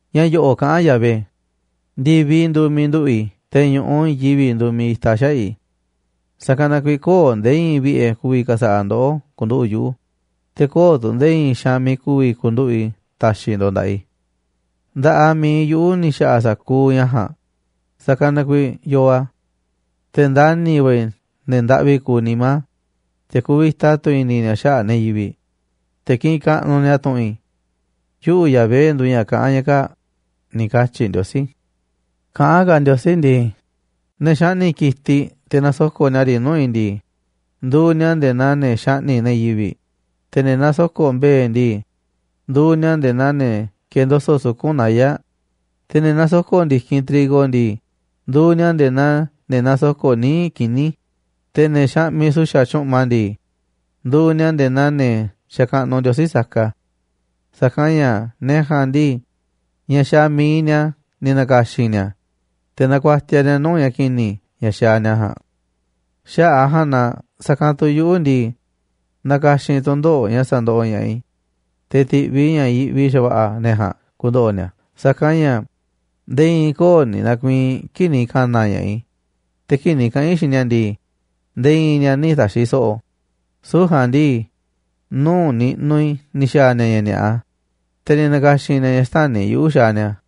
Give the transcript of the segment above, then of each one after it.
Ña̱ yo̱ꞌo̱ꞌ kaꞌán Yahvé: “Ndi̱viꞌ nduuꞌ miiꞌ nduꞌu̱ꞌ i̱, te̱ ñu̱ꞌuꞌ i̱i̱n yivi̱ꞌ nduuꞌ miiꞌ itaꞌ xaꞌa̱ꞌ i̱. Sa̱kanꞌ na kuiiꞌ köo̱ꞌ nde̱e̱ i̱i̱n vi̱ꞌe̱ ku̱vi̱ ka̱sa̱ꞌa̱ ndoꞌó ku̱nduꞌu̱ꞌ yuꞌu̱, te̱ köo̱ꞌ tu̱ nde̱e̱ i̱i̱n xaanꞌ miiꞌ ku̱vi̱ ku̱nduꞌu̱ꞌ i̱ ta̱xi̱ ndo̱ꞌ nda̱ꞌaꞌ i̱. Nda̱ꞌaꞌ miiꞌ yuꞌu̱ ni̱ xa̱ꞌa̱ sa̱kuuꞌ ña̱ ja̱a̱nꞌ, sa̱kanꞌ na kuiiꞌ yoo a̱. Te̱ ndani̱ va̱ i̱ ne̱ ndaꞌvi kuuꞌ nimá, te̱ kuvita tu̱ i̱ni̱ ni̱a̱ xaꞌa̱ꞌ ne̱ yivi̱ꞌ, te̱ kiꞌinꞌ kaꞌnuꞌ ni̱a̱ tu̱ꞌu̱n i. Yuꞌu̱ Yahvé nduuꞌ ña̱ kaꞌán ña̱ kaa̱ꞌ”, ni̱ katyi̱ Ndiosí. Kaꞌán ka̱ Ndiosí ndii: “Ne̱ xaꞌni̱ꞌ ki̱tiꞌ te̱ nasoko̱ꞌ ni̱a̱ riꞌ nuu̱ꞌ i̱ ndii, nduuꞌ ni̱a̱ nde̱e̱ naa ne̱ xaꞌni̱ꞌ ne̱ yivi̱ꞌ. Te̱ ne̱ nasoko̱ꞌ mbe̱e̱ ndii, nduuꞌ ni̱a̱ nde̱e̱ naa ne̱ kendoso̱ꞌ suku̱nꞌ naya̱ꞌ. Te̱ ne̱ nasoko̱ꞌ ndi̱kinꞌ trigo ndii, nduuꞌ ni̱a̱ nde̱e̱ naa ne̱ nasoko̱ꞌ níiꞌ kini̱. Te̱ ne̱ xaꞌmiꞌ su̱xa̱ tyu̱ꞌma ndii, nduuꞌ ni̱a̱ nde̱e̱ naa ne̱ xakaꞌnuꞌ ndiosí saka. Sa̱kanꞌ ña̱ ne̱ ja̱a̱nꞌ ndii, ña̱ xaaꞌ mi̱iꞌ ni̱a̱ ni̱ na̱ka̱xi̱n ni̱a̱, te̱ nakuatiaꞌ ni̱a̱ nuu̱ꞌ ña̱ ki̱ni̱ ña̱ xaaꞌ ni̱a̱ ja̱a̱nꞌ. Xaꞌa̱ꞌ a̱ ja̱a̱nꞌ na sa̱kanꞌ tu̱ yuꞌu̱ ndii, na̱ka̱xi̱n i̱ tu̱ndoꞌo̱ꞌ ña̱ sa̱ndoꞌoꞌ ña̱ꞌaꞌ i̱, te̱ ti̱ꞌviꞌ i̱ ña̱ yiꞌvi xa̱va̱ꞌa̱ ne̱ ja̱a̱nꞌ ku̱ndo̱ꞌo̱ ni̱a̱. Sa̱kanꞌ ña̱ nde̱e̱ i̱i̱n köo̱ꞌ ni̱ na̱ku̱i̱i̱n kii̱ꞌ ni̱ ka̱na̱ ña̱ꞌaꞌ i̱. Te̱ kii̱ꞌ ni̱ kaꞌa̱n i̱ xiinꞌ ni̱a̱ ndii, nde̱e̱ i̱i̱n ni̱a̱ nï̱ ta̱xi̱ so̱ꞌo̱. Süu̱ꞌ ja̱a̱nꞌ ndii, nuu̱ꞌ niꞌnuꞌ i̱ ni̱ xa̱a̱ ni̱a̱ ña̱ ni̱a̱ꞌa, te̱ ni̱ na̱ka̱xi̱n ni̱a̱ ña̱ xtäni̱ yuꞌu̱ xaaꞌ ni̱a̱.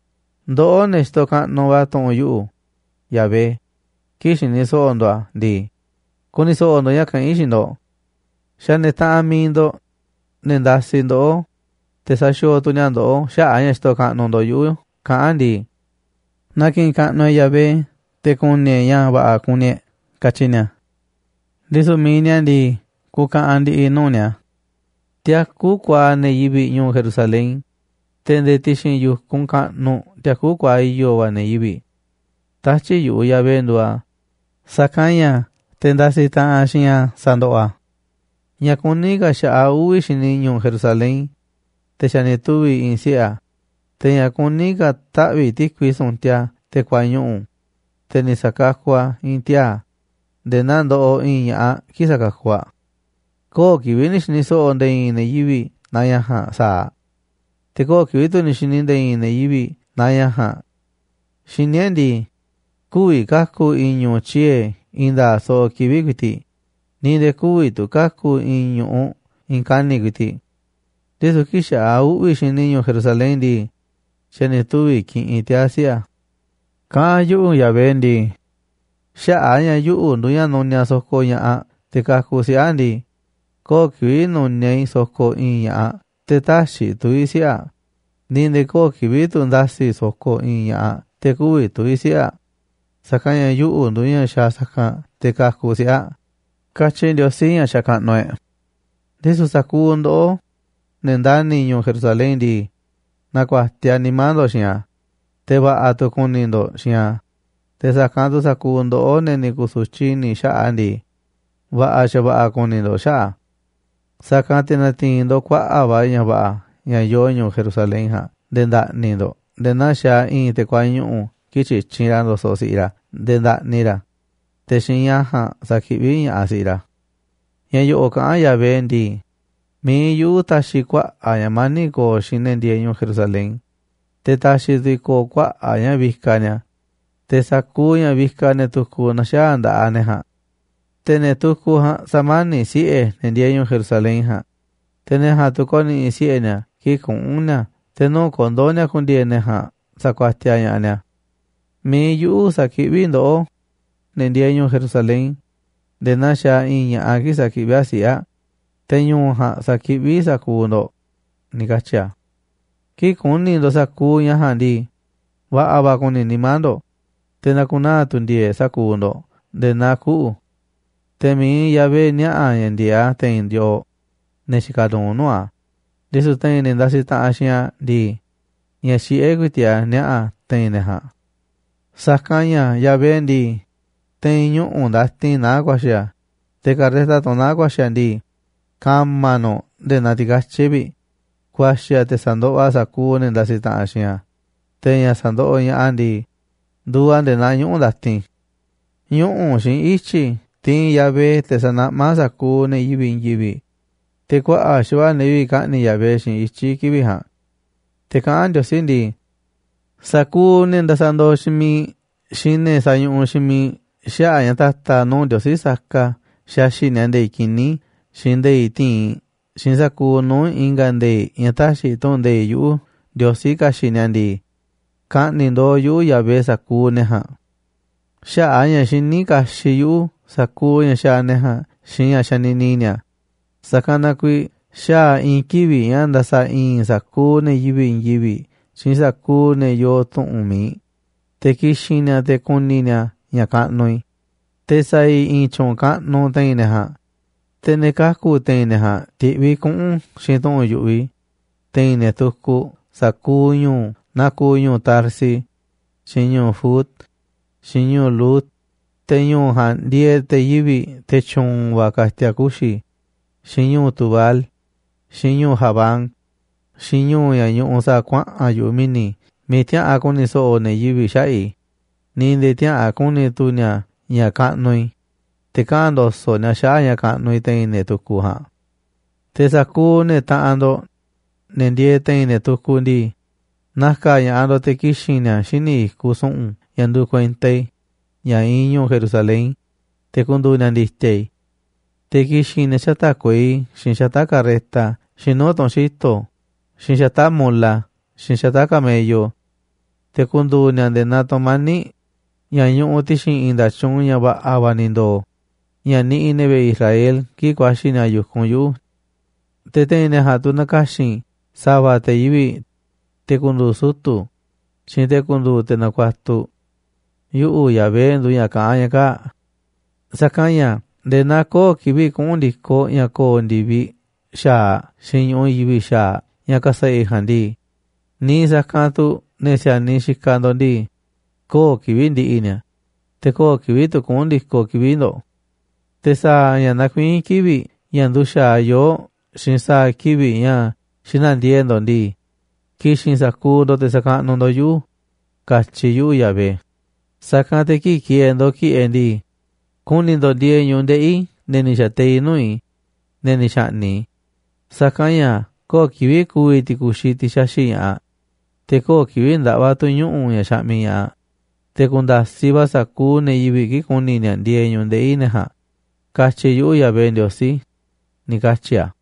’Ndoꞌó, ne̱ xitoꞌ kaꞌnuꞌ va̱ tu̱ꞌu̱n yu̱ꞌuꞌ, Yahvé, kii̱ꞌ xini so̱ꞌo̱ ndo̱ꞌ a̱ ndii, ku̱ni̱ so̱ꞌo̱ ndo̱ꞌ ña̱ kaꞌán a̱ xiinꞌ ndo̱ꞌ. Xa̱ ne̱ taꞌanꞌ mi̱iꞌ ndo̱ꞌ, ne̱ ndasiꞌ ndoꞌó, te̱ saxiooꞌ tu̱ ni̱a̱ ndoꞌó xaꞌa̱ꞌ a̱ ña̱ xitoꞌ kaꞌnuꞌ ndo̱ꞌ yuꞌu̱, kaꞌán ndii: Na ki̱ꞌi̱n kaꞌnuꞌ e̱ꞌ Yahvé, te̱ ku̱ni̱ e̱ꞌ ña̱ va̱ꞌa̱ kuni ndoꞌ, katyi ni̱a̱. ’Ndisu̱ mi̱iꞌ ni̱a̱ ndii, ku̱ka̱ꞌa̱n ndi̱ꞌi̱ nuu̱ꞌ ni̱a̱. Tiakú kuaaꞌ ne̱ yivi̱ꞌ ñu̱u̱ Jerusalén. Te̱ nde̱e̱ ti̱xi̱n yu̱kunꞌ kaꞌnuꞌ tiakú kuaaꞌ i̱yo̱ va̱ ne̱ yivi̱ꞌ. Tatyi̱ꞌ yu̱ꞌuꞌ, Yahvé, nduuꞌ a̱, sa̱kanꞌ ña̱ te̱ ndasiꞌ taꞌanꞌ xiinꞌ a̱ sandoꞌoꞌ a̱. ’Ña̱ kuní ka̱ xa̱ꞌaꞌ uꞌvi̱ xini ñu̱u̱ Jerusalén, te̱ xa̱ ni̱ tuvi̱ i̱i̱n siꞌe̱ a̱. Te̱ ña̱ kuní ka̱ taꞌvi̱ꞌ ti̱kui su̱ntiaꞌ te̱ kuañuꞌu̱, te̱ ni̱ sa̱kakuꞌ a̱ i̱i̱n tiaa̱ nde̱e̱ naa ndoꞌoꞌ i̱i̱n ña̱ꞌaꞌ kii̱ꞌ sakakuꞌ aꞌ. Köo̱ꞌ kivi̱ꞌ ni̱ xi̱ni̱ so̱ꞌo̱ nde̱e̱ i̱i̱n ne̱ yivi̱ꞌ naa ña̱ ja̱a̱nꞌ sa̱aꞌ. Te̱ köo̱ꞌ kivi̱ꞌ tu̱ ni̱ xi̱ni̱ nde̱e̱ i̱i̱n ne̱ yivi̱ꞌ naa ña̱ ja̱a̱nꞌ. Xiní e̱ꞌ ndii, kü̱vi̱ ka̱ku̱ i̱i̱n ñu̱u̱ tyiee̱ i̱i̱n nda̱a̱ꞌ soꞌoꞌ kivi̱ꞌ ku̱i̱ti̱ꞌ ni̱ nde̱e̱ kü̱vi̱ tu̱ ka̱ku̱ i̱i̱n ñu̱ꞌuꞌ i̱i̱n kani̱ꞌ ku̱i̱ti̱ꞌ. Ndisu̱ kii̱ꞌ xa̱ꞌaꞌ uꞌvi̱ xini ñu̱u̱ Jerusalén ndii, xa̱ ni̱ tuvi̱ kiꞌinꞌ tiaa̱ siꞌe̱ a̱.” Kaꞌán yuꞌu̱ Yahvé ndii: “Xaꞌa̱ꞌ a̱ ña̱ yuꞌu̱ nduuꞌ ña̱ nuniaꞌ sokoꞌ ña̱ꞌaꞌ te̱ kakuꞌ siꞌe̱ aꞌ ndii, köo̱ꞌ kivi̱ꞌ nu̱niaꞌ i̱ sokoꞌ i̱i̱n ña̱ꞌaꞌ te̱ tä̱xi̱ i̱ tuvi̱ siꞌe̱ aꞌ, ni̱ nde̱e̱ köo̱ꞌ kivi̱ꞌ tu̱ nda̱si̱ i̱ sokoꞌ i̱i̱n ña̱ꞌaꞌ te̱ kü̱vi̱ tuvi̱ siꞌe̱ aꞌ. Sa̱kanꞌ ña̱ yuꞌu̱ nduuꞌ ña̱ xaaꞌ sa̱kanꞌ te̱ kakuꞌ siꞌe̱ aꞌ”, katyi Ndiosí ña̱ xakaꞌnuꞌ e̱ꞌ. Ndisu̱ sa̱kuuꞌ ndoꞌó, ne̱ ndani̱ ñu̱u̱ Jerusalén ndii, na̱ku̱a̱tiaꞌ nimá ndo̱ꞌ xiinꞌ a̱, te̱ va̱ꞌa̱ tu̱ ku̱ni̱ ndo̱ꞌ xiinꞌ a̱. Te̱ sa̱kanꞌ tu̱ sa̱kuuꞌ ndoꞌó, ne̱ ni̱ ku̱su̱tyiꞌ i̱ni̱ xaꞌa̱ꞌ a̱ ndii, va̱ꞌa̱ xa̱va̱ꞌa̱ kuni ndo̱ꞌ xaꞌa̱ꞌ a̱. Sa̱kanꞌ te̱ na̱ti̱i̱n ndo̱ꞌ kuaꞌa̱ꞌ va̱ ña̱ va̱ꞌa̱ ña̱ yoo ñu̱u̱ Jerusalén ja̱a̱nꞌ nde̱e̱ nda̱ꞌni̱ ndo̱ꞌ nde̱e̱ naa xaaꞌ i̱i̱n te̱ kuañuꞌu̱ kii̱ꞌ tyityinꞌ ra̱ ndo̱soꞌ si̱ꞌiꞌ ra̱ nde̱e̱ ndaꞌni ra̱, te̱ xiinꞌ ña̱ ja̱a̱nꞌ sakiꞌví ña̱ꞌaꞌ si̱ꞌiꞌ ra̱. Ña̱ yo̱ꞌo̱ꞌ kaꞌán Yahvé ndii: “Mi̱iꞌ yuꞌu̱ ta̱xi̱ kuaꞌa̱ꞌ ña̱ mani̱ꞌ ko̱o̱ xiinꞌ ne̱ ndieeꞌ ñu̱u̱ Jerusalén. Te̱ ta̱xi̱ tu̱ i̱ ko̱o̱ kuaꞌa̱ꞌ ña̱ vikaꞌ ni̱a̱, te̱ sa̱kuuꞌ ña̱ vikaꞌ ne̱ tukuꞌ na̱xaa̱ nda̱ꞌaꞌ ne̱ ja̱a̱nꞌ. Te̱ ne̱ tukuꞌ ja̱a̱nꞌ sa̱mani̱ꞌ siꞌe̱ ne̱ ndieeꞌ ñu̱u̱ Jerusalén ja̱a̱nꞌ. Te̱ ne̱ ja̱a̱nꞌ tu̱ ko̱ni̱ꞌi̱ siꞌe̱ ni̱a̱ kii̱ꞌ kuꞌu̱n ni̱a̱, te̱ nuu̱ꞌ kondo̱ ni̱a̱ ku̱ndi̱e̱e̱ ne̱ ja̱a̱nꞌ sakuatiaꞌ ña̱ꞌaꞌ ni̱a̱. Mi̱iꞌ yuꞌu̱ sa̱kiꞌví ndoꞌó, ne̱ ndieeꞌ ñu̱u̱ Jerusalén, nde̱e̱ naa xaaꞌ i̱i̱n ña̱ꞌaꞌ kii̱ꞌ sakiꞌví aꞌ siꞌe̱ aꞌ, te̱ ñu̱u̱ ja̱a̱nꞌ sa̱kiꞌví i̱ sa̱kuuꞌ ndo̱ꞌ”, ni̱ katyi̱ a̱. Kii̱ꞌ ku̱ni̱ ndo̱ꞌ sa̱kuuꞌ ña̱ ja̱a̱nꞌ ndii, va̱ꞌa̱ va̱ ku̱ni̱ nimá ndo̱ꞌ. Te̱ na̱ku̱naa̱ tu̱ ndi̱e̱e̱ꞌ sa̱kuuꞌ ndo̱ꞌ nde̱e̱ naa kuꞌu̱. Te̱ miiꞌ Yahvé niaꞌa̱ ña̱ ndi̱e̱eꞌ a̱ te̱i̱n yooꞌ, ne̱ xikaꞌ nuuꞌ nuu̱ꞌ a̱. Ndisu̱ te̱i̱n ne̱ ndasiꞌ taꞌanꞌ xiinꞌ a̱ ndii, ña̱ xiꞌé ku̱i̱ti̱ꞌ a̱ niaꞌa̱ a̱ te̱i̱n ne̱ ja̱a̱nꞌ. Sa̱kanꞌ ña̱ Yahvé ndii, te̱i̱n ñuꞌu̱ ndatin naá a̱ ku̱a̱xi̱ a̱. Te̱ karreta, tunꞌ naá a̱ ku̱a̱xi̱ a̱ ndii, ka̱ma̱ nu̱ꞌ nde̱e̱ naa ti̱katyi̱ꞌ vi̱ꞌ. Ku̱a̱xi̱ a̱ te̱ sa̱ndoꞌoꞌ a̱ sa̱kuuꞌ ne̱ ndasiꞌ taꞌanꞌ xiinꞌ a̱, te̱ ña̱ sa̱ndoꞌoꞌ ña̱ꞌaꞌ a̱ ndii, nduuꞌ a̱ nde̱e̱ naa ñuꞌu̱ ndatin. Ñuꞌu̱ xiinꞌ ityi̱ tiinꞌ Yahvé, te̱ sa̱naꞌmá a̱ sa̱kuuꞌ ne̱ yivi̱ꞌ i̱i̱n yivi̱ꞌ, te̱ kuaꞌa̱ꞌ xa̱va̱ꞌa̱ ne̱ yivi̱ꞌ ka̱ꞌni̱ꞌ Yahvé xiinꞌ ityi̱ kivi̱ꞌ ja̱a̱nꞌ. Te̱ kaꞌán Ndiosí ndii: “Sa̱kuuꞌ ne̱ ndasaꞌ ndooꞌ xiinꞌ miiꞌ xiinꞌ ne̱ sañuꞌuꞌ xiinꞌ miiꞌ xaꞌa̱ꞌ ña̱ ta̱ta̱ nuu̱ꞌ ndiosí saka xixiꞌ ni̱a̱ nde̱i̱ꞌ kini̱ xiinꞌ nde̱i̱ꞌ ti̱inꞌ xiinꞌ sa̱kuuꞌ nuu̱ꞌ i̱nga̱ nde̱i̱ꞌ ña̱ täxiꞌ tu̱ꞌu̱n nde̱iꞌ yuꞌu̱, Ndiosí, ka̱xi̱ꞌ ni̱a̱ ndii, ka̱ꞌni̱ꞌ ndooꞌ yuꞌu̱, Yahvé, sa̱kuuꞌ ne̱ ja̱a̱nꞌ. ’Xaꞌa̱ꞌ a̱ ña̱ xiní kaxiꞌ yuꞌu̱ sa̱kuuꞌ ña̱ xaaꞌ ne̱ jaa̱nꞌ xiinꞌ ña̱ xanini ni̱a̱, sa̱kan na kuiiꞌ xaa̱ i̱i̱n kivi̱ꞌ ña̱ nda̱sa̱ i̱i̱n i̱ sa̱kuuꞌ ne̱ yivi̱ꞌ i̱i̱n yivi̱ꞌ xiinꞌ sa̱kuuꞌ ne̱ yoo tu̱ꞌu̱n mi̱iꞌ, te̱ ki̱xi̱n ni̱a̱ te̱ ku̱ni̱ ni̱a̱ ña̱ kaꞌnuꞌ i̱. Te̱ sa̱a̱ i̱ i̱i̱n tyu̱u̱n kaꞌnuꞌ te̱i̱n ne̱ ja̱a̱nꞌ. Te̱ ne̱ kaku̱ te̱i̱n ne̱ ja̱a̱nꞌ ti̱ꞌviꞌ i̱ kuꞌu̱n xiinꞌ tu̱ꞌu̱n yu̱ꞌuꞌ i̱ te̱i̱n ne̱ tukuꞌ sa̱kuuꞌ ñu̱u̱, naa kuuꞌ ñu̱u̱ Tarsis, xiinꞌ ñu̱u̱ Fut, xiinꞌ ñu̱u̱ Lud, te̱ ñu̱u̱ ja̱a̱nꞌ ndieeꞌ te̱ yivi̱ꞌ, te̱ tyu̱u̱n va̱ ka̱ti̱a̱ kuxi̱, xiinꞌ ñu̱u̱ Tubal, xiinꞌ ñu̱u̱ Javán, xiinꞌ ñu̱u̱ ña̱ ñuꞌuꞌ sa̱a̱ kuaꞌa̱n yu̱ꞌuꞌ mi̱ni̱ miiꞌ tiäꞌa̱an ku̱ni̱ so̱ꞌo̱ ne̱ yivi̱ꞌ xaꞌa̱ꞌ i̱, ni̱ nde̱e̱ tiäꞌa̱an ku̱ni̱ tu̱ ni̱a̱ ña̱ kaꞌnuꞌ i̱, te̱ kaꞌa̱n ndo̱so̱ꞌ ni̱a̱ xaꞌa̱ꞌ ña̱ kaꞌnuꞌ i̱ te̱i̱n ne̱ tukuꞌ ja̱a̱nꞌ. Te̱ sa̱kuuꞌ ne̱ taꞌanꞌ ndo̱ꞌ, ne̱ ndieeꞌ te̱i̱n ne̱ tukuꞌ ndii, na̱ka̱ ña̱ꞌaꞌ ndo̱ꞌ te̱ ki̱xi̱n ni̱a̱ xíniꞌ i̱kuꞌ su̱ꞌu̱n ña̱ nduuꞌ kuenta i̱, ña̱ iinꞌ ñu̱u̱ Jerusalén, te̱ ku̱ndu̱u̱ ni̱a̱ ndi̱ti̱a̱ i̱. Te̱ ki̱xi̱n ni̱a̱ xata̱ꞌ kuei xiinꞌ xata̱ꞌ carreta xiinꞌ nuu̱ꞌ tunꞌ xi̱to̱ xiinꞌ xata̱ꞌ mola xiinꞌ xata̱ꞌ camello. Te̱ ku̱ndu̱u̱ ni̱a̱ nde̱e̱ naa tu̱mani̱ꞌ ña̱ ñuꞌuꞌ ti̱xi̱n i̱i̱n nda̱tyuunꞌ ña̱ va̱ꞌa̱ va̱ ni̱ ndo̱o̱, ña̱ niꞌiꞌ ne̱ vi̱ꞌe̱ Israel kii̱ꞌ ku̱a̱xi̱ ni̱a̱ yu̱kunꞌ yuꞌu̱. Te̱ te̱i̱n ne̱ ja̱a̱nꞌ tu̱ na̱ka̱xi̱n i̱ sa̱va̱ te̱ yivi̱ꞌ, te̱ ku̱ndu̱u̱ sutu̱, xiinꞌ te̱ ku̱ndu̱u̱ te̱ nakuatuꞌ. Yuꞌu̱ Yahvé nduuꞌ ña̱ kaꞌán ña ka̱a̱ꞌ. ’Sa̱kanꞌ ña̱ nde̱e̱ naa köo̱ꞌ kivi̱ꞌ kuꞌu̱n ndi̱koꞌ ña̱ ko̱o̱ ndi̱viꞌ xa̱aꞌ xiinꞌ ñu̱ꞌuꞌ i̱i̱n yivi̱ꞌ xa̱aꞌ ña̱ ka̱sa̱ꞌa̱ i̱ ja̱a̱nꞌ ndii, niiꞌ sa̱kanꞌ tu̱ ne̱ si̱a̱niꞌ xikaꞌ ndo̱ꞌ ndii, köo̱ꞌ kivi̱ꞌ ndi̱ꞌi̱ ni̱a̱, te̱ köo̱ꞌ kivi̱ꞌ tu̱ kuꞌu̱n ndi̱koꞌ kivi̱ꞌ ndo̱ꞌ. Te̱ sa̱a̱ ña̱ nakuiín kivi̱ꞌ ña̱ nduxa̱aꞌ yoo̱ꞌ xiinꞌ sa̱a̱ kivi̱ꞌ ña̱ xina̱ndiee̱ꞌ ndo̱ꞌ ndii, ki̱xi̱n sa̱kuuꞌ ndo̱ꞌ te̱ sa̱kaꞌnuꞌ ndo̱ꞌ yuꞌu̱, katyi̱ yuꞌu̱, Yahvé. Sa̱kanꞌ te̱ kii̱ꞌ ki̱e̱e̱ ndo̱ꞌ ki̱ꞌe̱ ndii, ku̱ni̱ ndo̱ꞌ ndieeꞌ ñu̱ꞌuꞌ ndeꞌi̱ ne̱ ni̱ xa̱teiꞌ nuu̱ꞌ i̱, ne̱ ni̱ xa̱ꞌni̱ꞌ i̱. Sa̱kanꞌ ña̱ köo̱ꞌ kivi̱ꞌ ku̱vi̱ ti̱ku̱xiꞌ, tiꞌ xaxi̱ꞌ ña̱ꞌaꞌ, te̱ köo̱ꞌ kivi̱ꞌ ndaꞌva̱ tu̱ ñuꞌu̱ ña̱ xaꞌmiꞌ ña̱ꞌaꞌ. Te̱ ku̱nda̱siꞌ va̱ sa̱kuuꞌ ne̱ yivi̱ꞌ kii̱ꞌ ku̱ni̱ ni̱a̱ ndieeꞌ ñu̱ꞌuꞌ ndeꞌi̱ ne̱ ja̱a̱nꞌ, katyi yuꞌu̱, Yahvé Ndiosí”, ni̱ katyi̱ a̱.